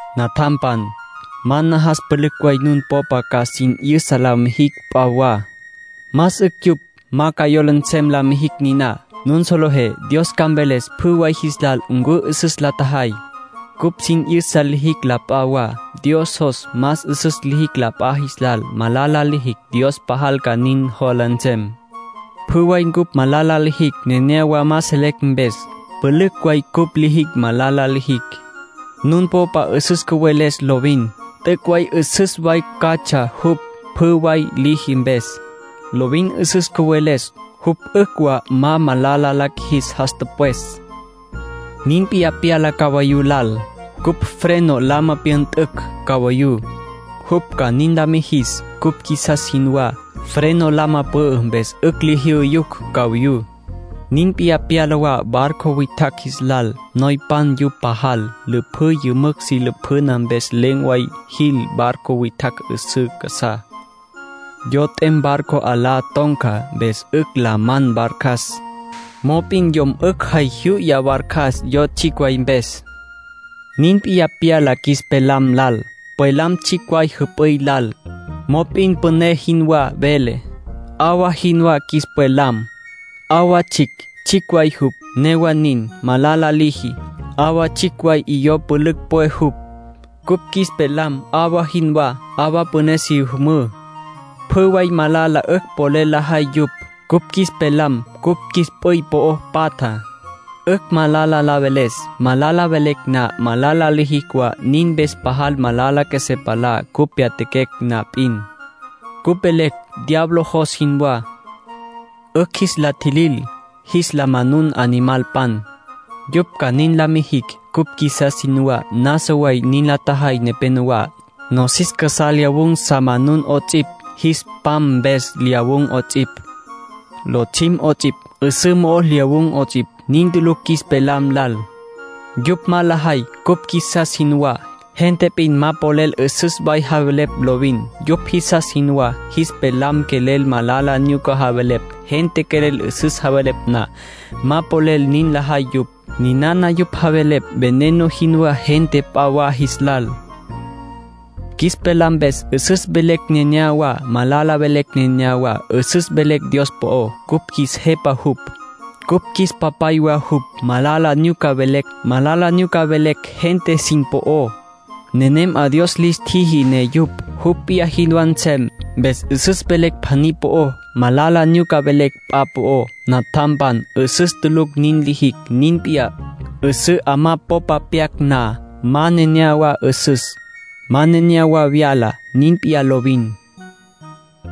Natjampan, ma najas pülücj way nun popa ca sin 'yüsa la mijicj p'a wa. Más 'ücj yupj ma ca yola nsem la mijicj niná. Nun solejé Dios ca mveles pjü way jis lal ncu 'üsüs la tjajay. Cupj sin 'yüsa lijicj la p'a wa, Dios jos más 'üsüs lijicj la p'a jis lal. Malala lijicj, Dios pajal ca nin jola nsem. Pjü way ncupj malala lijicj neneyawá ma selecj mpes. Pülücj way cupj lijicj malala lijicj. Nun popa 'üsüs cüweles lovin, t'üc' way 'üsüs way catsja jupj pjü way liji mpes. Lovin 'üsüs cüweles, jupj 'ücj wa ma malala la qjuijis jas tüpwes. Nin p'iyá pyala cabayú lal. Cupj freno lama pyüntücj cabayú, jupj ca nin la mijis cupj qjuisas jinwá. Freno lama pü'ü mpes 'ücj li jyu'yucj cabayú. Nin p'iyá pyala wa barco witjacj jis lal. Noypan yupj pajal. Lüpjǘ yümücj si lapjüna mpes len̈ way jil barco witjacj 'üsǘ casá. Yo t'em barco 'alá ton̈ca, mpes 'ücj la man barcas. Yo niná tsjicj way jupj; mop'in yom 'ücj jay juyuya barcas yo tsjicj way mpes. Nin p'iyá pyala qjuis pelam lal. Pwelam tsjicj way jüp'üy lal. Mop'in püné jinwá vele. 'Awa jinwá qjuis pwelam. 'Awa tsjicj, tsjicj way jupj; newa nin, malala liji. 'Awa tsjicj way 'iyó pülücj pwe jupj. Cupj qjuis pelam 'awa jinwá, 'awa püné si müjü. Pjü way malala 'ücj polel lajay yupj. Cupj qjuis pelam cupj qjuis p'üy po'o patja, 'ücj malala la veles. Malala velecj na, malala lijicj wa. Nin mpes pajal malala qjuesé palá cupj pyatjaquecj na p'in. Cupj velecj diablo jos jinwá. 'Ücj jis la tjilil, jis la manun animalpan, yupj ca nin la mijicj cupj qjuisas jinwá. Nasa way nin la tjajay nepenowá. Nosis casá lyawun̈ sa manun 'ots'ipj, jis pam mpes lyawun̈ 'ots'ipj, lotsjim 'ots'ipj, 'üsǘ mo'o lyawun̈ 'ots'ipj. Nin tulucj qjuis pelam lal. Yupj ma lajay cupj qjuisas jinwá. Gente p'in ma polel 'üsüs way javelepj lovin, yupj jisas jinwá. Jis pelam quelel malala nyuca javelepj. Gente quelel 'üsüs javelepj na, ma polel nin lajay yupj. Ninana yupj javelepj veneno jinwá gente p'a wa jis lal. Qjuis pelam mpes 'üsüs velecj nenéyawa, malala velecj nenéyawa. 'Üsüs velecj Dios po'ó. Cupj qjuis Jepa jupj, cupj qjuis Papay wa jupj. Malala nyuca velecj gente sin po'ó, nenem 'a Dios lis tjiji ne yupj jupj p'iyá jinwá nsem. Mpes 'üsüs velecj pjaní po'ó, malala nyuca velecj p'a po'ó. Natjampan, 'üsüs tulucj nin lijicj. Nin p'iyá, 'üsǘ 'amá popa pyacj na, ma nenéyawa 'üsüs, ma nenéyawa vyaja. Nin p'iyá lovin.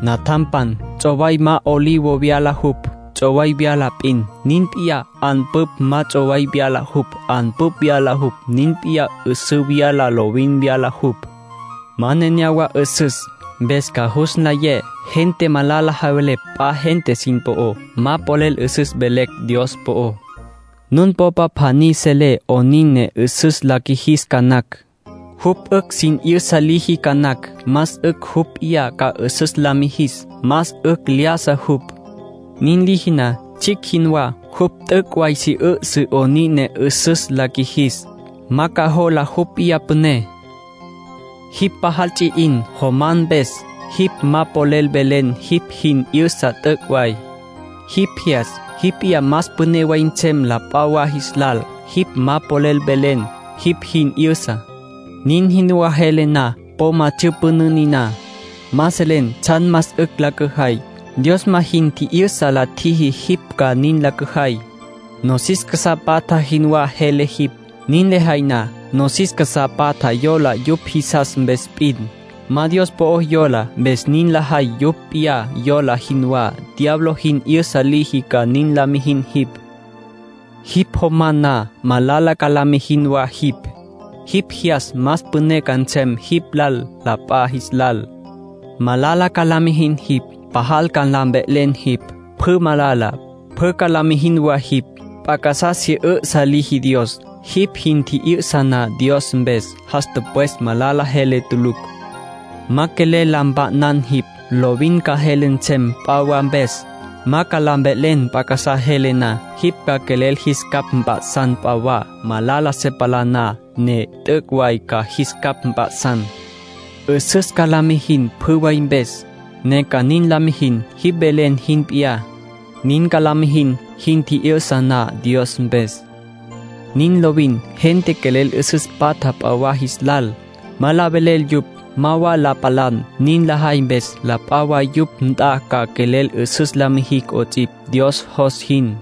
Natjampan, ts'oway ma olivo vyala jupj, ts'oway vyala p'in. Nin p'iyá 'anpüpj ma ts'oway vyala jupj; 'anpüpj vyala jupj. Nin p'iyá 'üsǘ vyaja lovin vyaja jupj, ma nenéyawa 'üsüs. Mpes ca jus nlayé gente malala javelepj p'a gente sin po'ó, ma polel 'üsüs mvelecj Dios po'ó. Nun popa pjaní selé 'onin ne 'üsüs la qjuijis ca nacj. Jupj 'ücj sin 'yüsa liji ca nacj. Más 'ücj jupj p'iyá ca 'üsüs la mijis. Más 'ücj lyájasa jupj, nin liji na, tsjicj jinwá. Jupj t'üc' way si 'üsǘ 'onin ne 'üsüs la qjuijis, ma ca jola jupj p'iyá püné. Jipj pajal ts'i 'in, jomam mpes, jipj ma polel velen jipj jin 'yüsa t'üc' way. Jipj jyas jipj p'iyá más püné way nsem la p'a wa jis lal, jipj ma polel velen jipj jin 'yüsa. Nin jinwá jele na, po ma tsyüpünǘ niná: ma selen tsjan más 'ücj la cüjay. Dios ma jin tji'yüsa la tjiji jipj ca nin la cüjay. Nosis casá patja jinwá jele jipj, nin lejay na. Nosis casá patja yola yupj jisas mpes p'in, ma Dios po'o yola, mpes nin lajay yupj p'iyá yola jinwá. Diablo jin 'yüsa liji ca nin la mijin jipj. Jipj jomam na, malala ca la mijin wa jipj. Jipj jyas más püné ca nsem jipj la p'a jis lal, malala ca la mijin jipj. Pajal ca la mve'len jipj. Pjü malala, pjü ca la mijin wa jipj. P'a casá si 'üsǘ liji Dios. Jipj jin tji'yüsa na Dios mpes, jas tüpwes malala jele tulucj. Ma ca quelel la mpa'nan jipj, lovin ca jele nsem p'a wa mpes. Ma ca la mve'len p'a casá jele na. Jipj ca quelel jis capj mp'a'san p'a wa, malala se palá na, ne t'üc' way ca jis capj mp'a'san. 'Üsüs ca la mijin pjü way mpes, ne ca nin la mijin, jipj velen jin p'iyá. Nin ca la mijin jin tji'yüsa na Dios mpes. Nin lovin. Gente quelel 'üsüs patja p'a wa jis lal, ma la velel yupj. Ma wa la palan. Nin lajay mpes, la p'a wa yupj nt'a ca quelel 'üsüs la mijicj 'ots'ipj Dios jos jin.